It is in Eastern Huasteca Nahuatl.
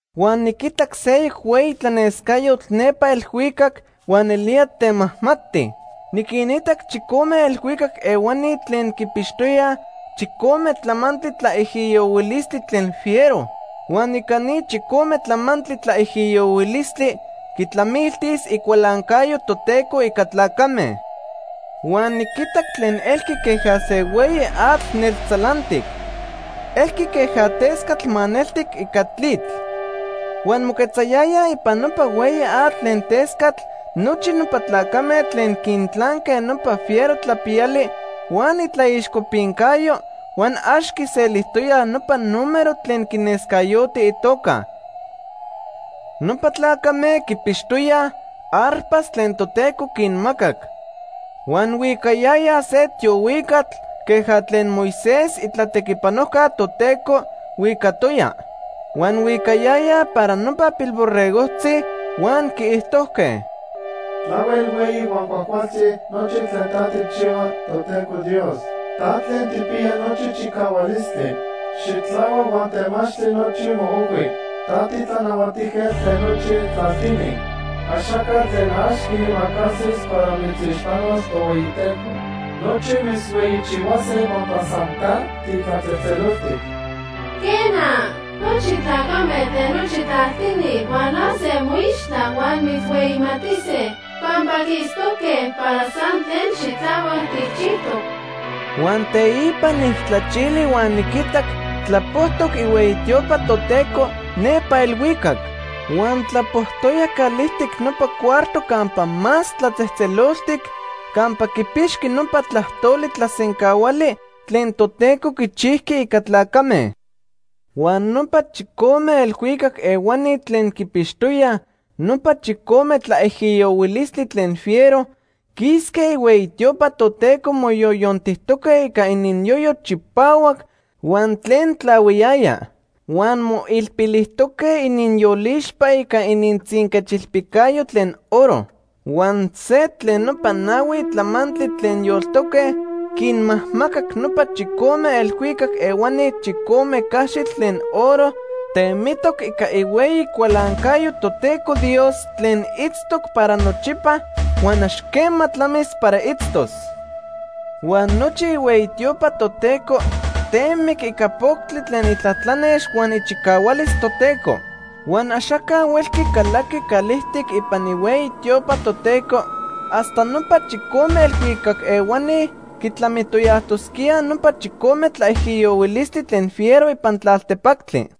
Huan niquitac seyoc hueyi tlanescayotl nepa elhuicac huan nelía temajmati. Niquinitac chicome elhuicac ehuani tlen quipixtoyaj chicome tlamantli tlaijiyohuilistli tlen fiero. Huan ica ni chicome tlamantli tlaijiyohuilistli quitlamiltis icualancayo Toteco ica tlacame. Huan niquitac tlen elqui queja se hueyi atl neltzalantic. Elqui queja tescatl maneltic ica tlitl. Huan moquetzayayaj ipan nopa hueyi atl tlen tescatl nochi nopa tlacame tlen quintlanque nopa fiero tlapiyali huan itlaixcopincayo, huan ax quiselijtoyaj nopa número tlen quinescayoti itoca. Nopa tlacame quipixtoyaj arpas tlen Toteco quinmacac. Huan huicayayaj se tiohuicatl queja tlen Moisés, itlatequipanojca Toteco, huicatoya. Huan huicayayaj para nopa Pilborregojtzi, huan quiijtojque: “Tlahuel hueyi huan cuajcualtzi nochi tlen ta tijchihua, Toteco Dios. Ta Tlen Tijpiya Nochi Chicahualistli. Xitlahuac huan temachtli nochi moojhui. Ta tiTlanahuatijquetl tlen nochi tlaltini. Axaca tlen ax quiimacasis para mitzixpanos, Tohueyiteco. Nochi mitzhueyichihuase pampa san ta titlatzejtzeloltic. Quena, nochi tlacame tlen nochi tlaltini hualase moixtla huan mitzhueyimatise, pampa quiitztoque para san tlen xitlahuac tijchijtoc.” Huan teipa nijtlachili huan niquitac tlapojtoc ihueyi tiopa Toteco nepa elhuicac. Huan tlapojtoya calijtic nopa cuarto Campa Más Tlatzejtzeloltic campa quipixqui nopa tlajtoli tlasencahuali tlen Toteco quichijqui ica tlacame. Huan nopa chicome elhuicac ehuani tlen quipixtoyaj nopa chicome tlaijiyohuilistli tlen fiero quisque ihueyi tiopa Toteco moyoyontijtoque ica ininyoyo chipahuac huan tlen tlahuiyaya. Huan moilpilijtoque ininyolixpa ica inintzinquechilpijcayo tlen oro. Huan se tlen nopa nahui tlamantli tlen yoltoque quinmajmacac nopa chicome elhuicac ehuani chicome caxitl tlen oro temitoc ica ihueyi cualancayo Toteco Dios tlen itztoc para nochipa huan ax quema tlamis para itztos. Huan nochi ihueyi tiopa Toteco temic ica poctli tlen itlatlanex huan ichicahualis Toteco. Huan axaca huelqui calaqui calijtic ipan ihueyi tiopa Toteco hasta nopa chicome elhuicac ehuani quitlamitoyajtosquíaj nopa chicome tlaijiyohuilistli tlen fiero ipan tlaltepactli.